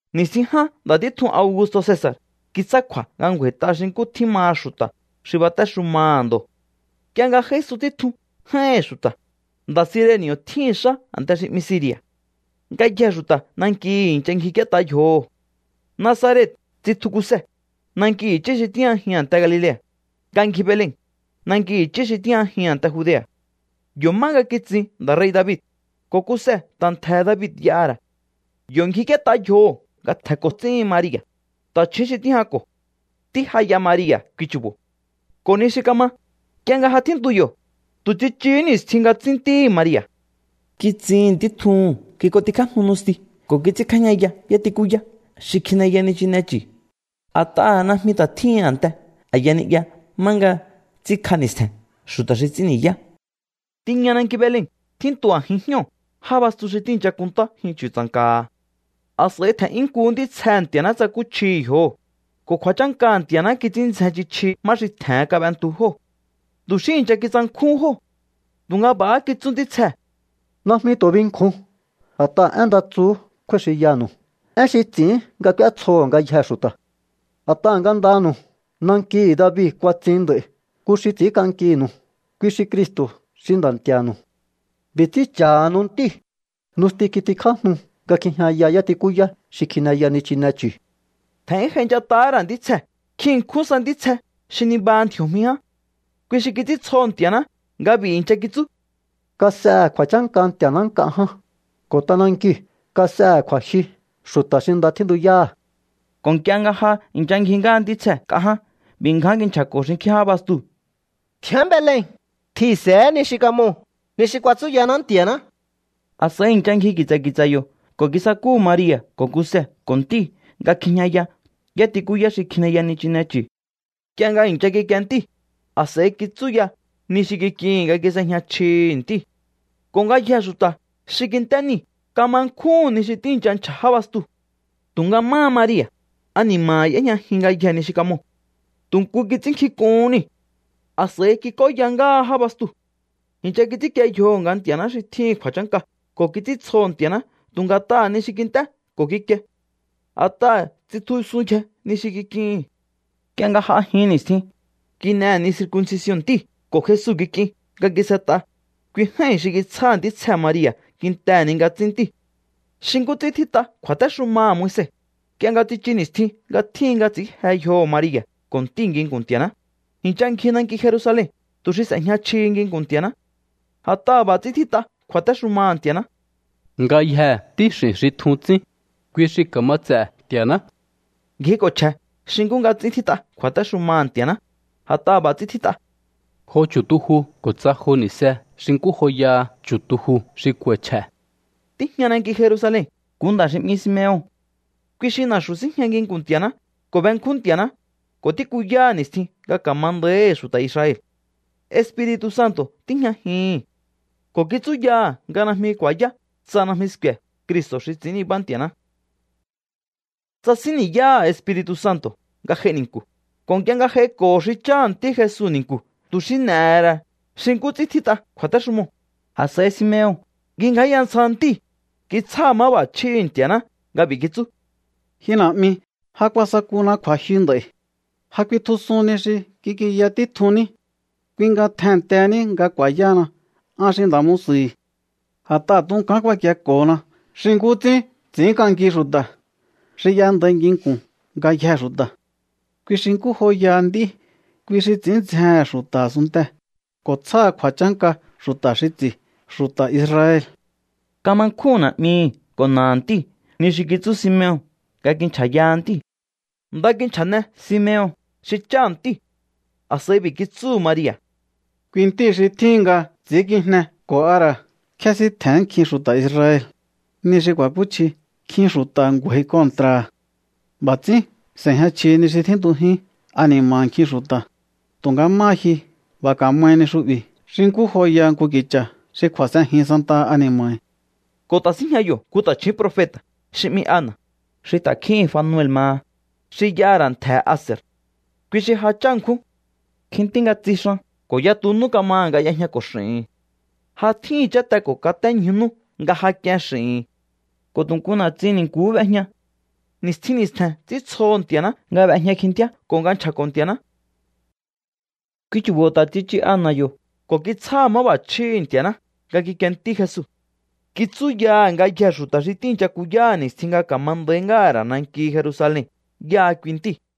Ni̱stjin ján nda̱ títjun Augusto̱ Cesa̱r kitsjá kju̱a̱ nga ngju̱a̱i̱t'a xi nkú tjín maha xu̱ta̱ xi batéxumaha̱ ndo̱. Nk'ie nga j'a̱ísun títjun j'áíhi̱n xu̱ta̱, nda̱ Cireni̱o̱ tjíhi̱n xá a̱nte xi 'mihi̱ Siri̱a̱. Ngayjee̱ xu̱ta̱ nankihi̱ i̱ncha ngjik'íét'a yjoho̱. Nazaret tsitju Kuse, nanki i̱chí xi tíjñajihi̱n a̱nte Galilea̱, nga ngji Belen, nanki i̱chí xi tíjñajihi̱n a̱nte Judea̱. Yo̱ má nga kitsin nda̱ rei̱ David, ko̱ Kuse ta̱ ntje̱he̱ David y'aha̱ ra̱. Yo̱ ngjik'íét'a yjoho̱ nga tje̱nko̱ ts'íhin Maria̱, ta̱chju̱ún xi tíjñako̱. Ntí ja y'a Maria̱ kui chu̱bo̱. Ko̱ ni xi kama, nk'ie nga ja tjíntu yo̱, tu̱ tsichuhú ni̱stjin nga tsín ntíhi̱ Maria̱. Kitsihi̱n ntí tjuhu̱n. Kik'ontikjájnu nusti ko̱ kits'ínkjájñaya yátikúyá xi kjineya nichine chu̱, a̱t'aha̱ najmi ta̱ tjíhin a̱nte a̱ya ni'ya má nga ts'ínkj'a ni̱stje̱n xu̱ta̱ xi ts'ín ni̱yá. Tiña nanki Belen tjíntu a̱jin jñóo̱ já bastu xi tíi̱ncha kunntá jyun chu̱tsa̱nka̱ha̱. A̱s'a̱i tje̱n'yún nkuhú ntítsjehe̱ Nti̱a̱ná tsakúchjihi̱ yjoho̱, ko̱ kju̱a̱chánkaha̱ Nti̱a̱ná kits'ín ndzjen chji chji má xi tje̱hen kab'entu jóo̱. Tu̱ xí i̱ncha kitsankjúhún jóo̱. Tu̱nga b'a̱há kitsú ntítsjee̱: —Najmi tu̱ binkjun. A̱t'aha̱ én nda tsuhú kjúái̱ xinyanu̱u, én xi ts'i̱ín nga k'úétsjoho̱ ngayjee̱ xu̱ta̱. A̱t'aha̱ ngandanu̱u nankihi̱ David kuatsin nd'a̱i̱ nku xi ts'i̱ínk'ankinu̱u, kui xi Cristo̱ xi Nda̱ Nti̱a̱nu̱u. B'i̱ ts'ín cha̱hanu ntíu̱. Nusti kitikjájnu nga kjijñaya yátikúyá xi kjineya nichine chu̱. Tje̱n'yún j'ainchat'ahá ra̱ ntítsjee̱ nkjin ṉkjún sa ntítsje xi nibaha ndji̱o̱jmi ján. Kui xi kits'íntsjoho̱ Nti̱a̱ná nga b'i̱ i̱ncha kitsú: ¡Kas'ehe̱ kju̱a̱chánka Nti̱a̱ná nk'a ján, ko̱ t'anankiu̱ kas'ehe̱ kju̱a̱jyu xu̱ta̱ xi nda tjíntuyáha̱! Ko̱ nk'ie nga ja i̱ncha ngji ngáha ntítsjee̱ nk'a ján, b'i̱ ngján kinchja̱ko̱ xinkjín já bastuu̱: —Tjián Belen. Tjihi̱nse̱é ni xi kamoo̱, ni xi kuatsúyaná Nti̱a̱ná. A̱s'a̱i i̱ncha ngji ki̱tsa̱ ki̱tsa̱ yo̱ ko̱ kisakúhu̱ Maria̱ ko̱ Kuse ko̱ ntíu̱ nga kjijñaya yátikúyá xi kjineya nichine chu̱. Nk'ie nga i̱ncha kikie ntíu̱, a̱s'a̱i kitsúya ni xi kik'ihi̱n nga kis'ejña chjihi̱ ntíu̱. Ko̱ ngayjee̱ xu̱ta̱ xi kint'é niu̱ kama nkjúhu̱n ni xi tíi̱ncha nchja̱ já bastuu̱. Tu̱nga máha Maria̱, ani̱ma̱ha̱ y'éjñajin ngayjee̱ ni xi kamoo̱. Tu̱ nku kits'ínnkjink'uhún niu̱. A̱s'a̱i kik'óya ngáha já bastuu̱. I̱ncha kits'ínkie yjoho̱ nga Nti̱a̱ná xi tjíhi̱n kju̱a̱chánka ko̱ kits'íntsjoho̱ Nti̱a̱ná tu̱ nga̱t'aha̱ ni xi kint'é ko̱ kikie. A̱t'aha̱ tsitjusunyje ni xi kik'ihi̱n. Nk'ie nga j'a jin ni̱stjin, kin'ehe̱ ni circuncision ntíu̱ ko̱ Jesu kik'in nga kis'et'a, kui j'ái̱n xi kitsjáha̱ ntítsjee̱ Maria̱ kintehe̱ ni nga tsín ntíu̱. Xi nkú ts'ín tjít'a kju̱a̱téxumaha̱ Moise, nk'ie nga tsichu ni̱stjin nga tjíhin nga ts'i̱ín je yjoho̱ Maria̱ ko̱ ntíu̱ nginku̱n Nti̱a̱ná, i̱ncha ngji nanki Jerusalen tu̱ xi s'e̱jña chjihi nginku̱n Nti̱a̱ná. A̱t'aha̱ b'a̱ ts'ín tjít'a kju̱a̱téxumaha̱ Nti̱a̱ná: “Ngayjee̱ ntíx'i̱n xi tjun tsín, kui xi ka̱ma ts'e̱ Nti̱a̱ná.” Ngjiko̱ chje̱ xi nkú nga ts'ín tjít'a kju̱a̱téxumaha̱ Nti̱a̱ná, a̱t'aha̱ b'a̱ ts'ín tjít'a: “Jo chu̱tuju ko̱ tsa jo ni̱se xi nkú joyaha chu̱tuju xi k'u̱a̱i̱ chje̱.” Tíjña nanki Jerusalen nku nda̱ xi 'mi Simeon. Kui xi na̱xu̱ síjña nginku̱n Nti̱a̱ná ko̱ benkjún Nti̱a̱ná ko̱ tíkuyáha̱ ni̱stjin nga ka̱ma nda̱íhi̱ xu̱ta̱ Israel. Espiri̱tu̱ Santo̱ tíjñajihi̱n ko̱ kitsúyaha̱ nga najmi ku̱a̱yá tsa najmi sku̱e̱ Cristo̱ xi ts'i̱ín nibá Nti̱a̱ná. Tsasín ni̱yáha̱ Espiri̱tu̱ Santo̱ nga j'ai ni̱nku̱, ko̱ nk'ie nga j'aiko̱ho̱ xi cháha̱ ntí Jesu ni̱nku̱ tu̱ xi n'e̱he̱ ra̱ xi nkú ts'ín tjít'a kju̱a̱téxumoo̱, a̱s'a̱i Simeon kingjáya ntsja ntíu̱. Kitsjáha̱ máb'a̱chjíhi̱ Nti̱a̱ná nga b'i̱ kitsú: Ji Na̱'mi, ja kuasakúna kju̱a̱jyu nd'a̱i̱. Ja kuitjusun ni xi kik'inya títjunní. Kui nga tjennteheni nga ku̱a̱yáhana an xi nda̱ musu̱hi̱. A̱t'aha̱ tunkán kuakieko̱hona xi nkú ts'ín ts'i̱ínk'anki xu̱ta̱, xi y'endai nginku̱n ngayjee̱ xu̱ta̱. Kui xi nkú joyaha nd'í, kui xi ts'i̱ín ndzjehe̱n xu̱ta̱ a̱sunntee̱, ko̱ tsjáha̱ kju̱a̱chánka xu̱ta̱ xi ts'i̱, xu̱ta̱ Israel. Kama nkjúhu̱n na̱'mihi̱ ko̱ na̱aha̱ ntíu̱ ni xi kitsú Simeon nga kincha̱yaha ntíu̱. Nda kinchja̱ne Simeon xi cháha̱ ntíu̱. A̱s'a̱i b'i̱ kitsúhu̱ Maria̱: —Kui ntíi̱ xi tjíhin nga ts'i̱ínkijne ko̱ a ra̱ kjésíntje̱n nkjin xu̱ta̱ Israel. Ni xi ku̱a̱kúchji nkjin xu̱ta̱ ngju̱a̱i̱ kontra̱ha̱. B'a̱ ts'ín s'e̱jña chjihi ni xi tjíntujín ani̱ma̱ha̱ nkjin xu̱ta̱. Tu̱nga máha ji, b'a̱ ka̱mahi ni xu'bi̱ xi nkú joyaha nku ki̱cha̱ xi kju̱a̱s'enjin santaha ani̱ma̱hi̱. Ko̱ ta̱ síjña yo̱ nku ta̱chju̱ún profeta̱ xi 'mi Ana̱, xi ta̱kjíhi̱n Fanuel maha, xi y'aha̱ ra̱ ntje̱he̱ Aser. Kui xi ja chá ṉkjún. Kjintí nga tsixan ko̱ yatu nú kamaha̱ nga y'ejñako̱ x'i̱hi̱n. Ja tjíhi̱n cháte ko̱ katé ñju nú nga ja k'ien x'i̱hi̱n. Ko̱ tu̱ nku na̱tsin ni̱nku̱hú b'ejña. Ni̱stjin ni̱stje̱n ts'íntsjoho̱ Nti̱a̱ná nga b'ejña kjintíá ko̱ nga nchja̱ko̱ Nti̱a̱ná. Kui chu̱bo̱ ta̱ tsichu Ana̱ yo̱ ko̱ kitsjáha̱ máb'a̱chjíhi̱ Nti̱a̱ná nga kikie ntí Jesu. Kitsúyaha̱ ngayjee̱ xu̱ta̱ xi tíi̱ncha kuyáha̱ ni̱stjin nga ka̱ma nda̱í ngáha̱ ra̱ nanki Jerusalen yáha kui ntíu̱.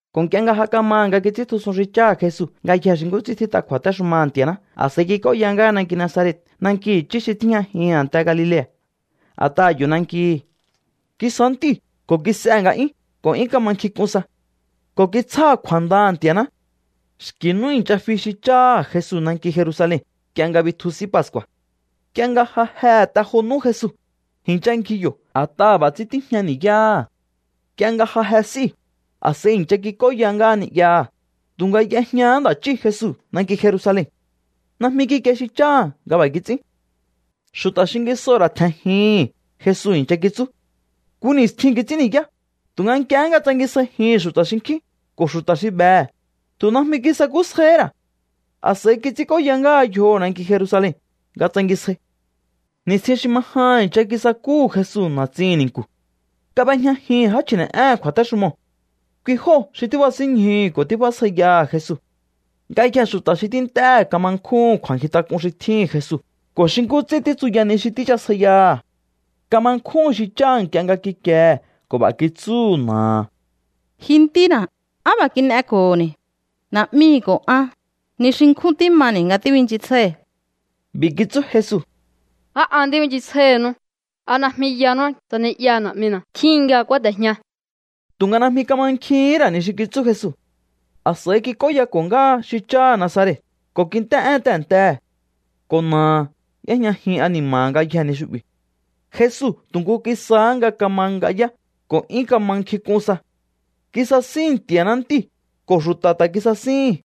Ko̱ nk'ie nga ja kamaha̱ nga kits'íntjusun xi cháha̱ Jesu ngayjee̱ xi nkú ts'ín tjít'a kju̱a̱téxumaha̱ Nti̱a̱ná, a̱s'a̱i kik'óya ngáha nanki Nazaret, nanki i̱chí xi tíjñajin a̱nte Galilea̱, a̱t'aha̱ yo̱ nankihi. Kisá ntíu̱ ko̱ kis'ehe̱ nga'yún ko̱ 'yún kama nkjink'un sa. Ko̱ kitsjáha̱ kju̱a̱ndaha̱ Nti̱a̱ná. Xki̱ nú i̱ncha fi xi cháha̱ Jesu nanki Jerusalen nk'ie nga bitju S'í Pascu̱a̱. Nk'ie nga ja jehe̱ te jo nú Jesu, i̱ncha ngji yo̱ a̱t'aha̱ b'a̱ ts'ín tíjña ni̱yáha̱. Nk'ie nga ja je s'íu̱, a̱s'a̱i i̱ncha kik'óya ngáha ni'yaha̱, tu̱nga y'ejñahá nda̱ chí Jesu nanki Jerusalen. Najmi kikie xi cháha̱ nga b'a̱ kits'ín. Xu̱ta̱ xingisoo̱ ra̱ tje̱njihi̱n Jesu i̱ncha kitsú. Nku ni̱stjin kits'ín ni̱yá, tu̱nga nk'iehé nga tsangisjaijíhi̱n xu̱ta̱ xinkjín ko̱ xu̱ta̱ xi behe̱, tu̱ najmi kisakúsjaihí ra̱. A̱s'a̱i kits'ínk'óya ngáha yjoho̱ nanki Jerusalen nga tsangisjai. Ni̱stjin xi ma jahan i̱ncha kisakúhu̱ Jesu na̱tsihi̱n ni̱nku̱. Kab'ejñajihi̱n já chji̱ne̱'éhe̱n kju̱a̱téxumoo̱. Kui jóo̱ xi tíbasínñjuhu̱ ko̱ tíbjásjaiyaha̱ Jesu. Ngayjee̱ xu̱ta̱ xi tínt'éhe̱ kama nkjúhu̱n kju̱a̱nkjintak'un xi tjíhi̱n Jesu ko̱ xi nkú ts'ín títsuya ni xi tíchasjaiyaha̱. Kama nkjúhu̱n xi cháha̱ nk'ie nga kikiehe̱ ko̱ b'a̱ kitsú na̱aha̱: —Ji ntína̱, ¿á b'a̱ kin'eko̱ho̱ni̱? Na̱'mihi̱ ko̱ an ni xi nkjún tímani̱ nga tíbinchisjái̱hi̱. B'i̱ kitsú Jesu: —¿Á an tíbinchisjáíhinú? ¿A najmi yanú tsa ni'yaha̱ na̱'mina̱ tjíhin nga kúáte̱jña? Tu̱nga najmi kamankjihín ra̱ ni xi kitsú Jesu. A̱s'a̱i kits'óyako̱ ngáha xi cháha̱ Nazaret ko̱ kint'é'én tehe̱ntehe̱. Ko̱ na̱aha̱ y'éjñajin ani̱ma̱ha̱ ngayjee̱ ni xu'bi̱. Jesu tu̱ nku kisáhá nga kama ng'ayá ko̱ 'yún kama nkjink'un sa. Kisasíhi̱n Nti̱a̱ná Ntíu̱ ko̱ xu̱ta̱ ta̱ kisasíhi̱n.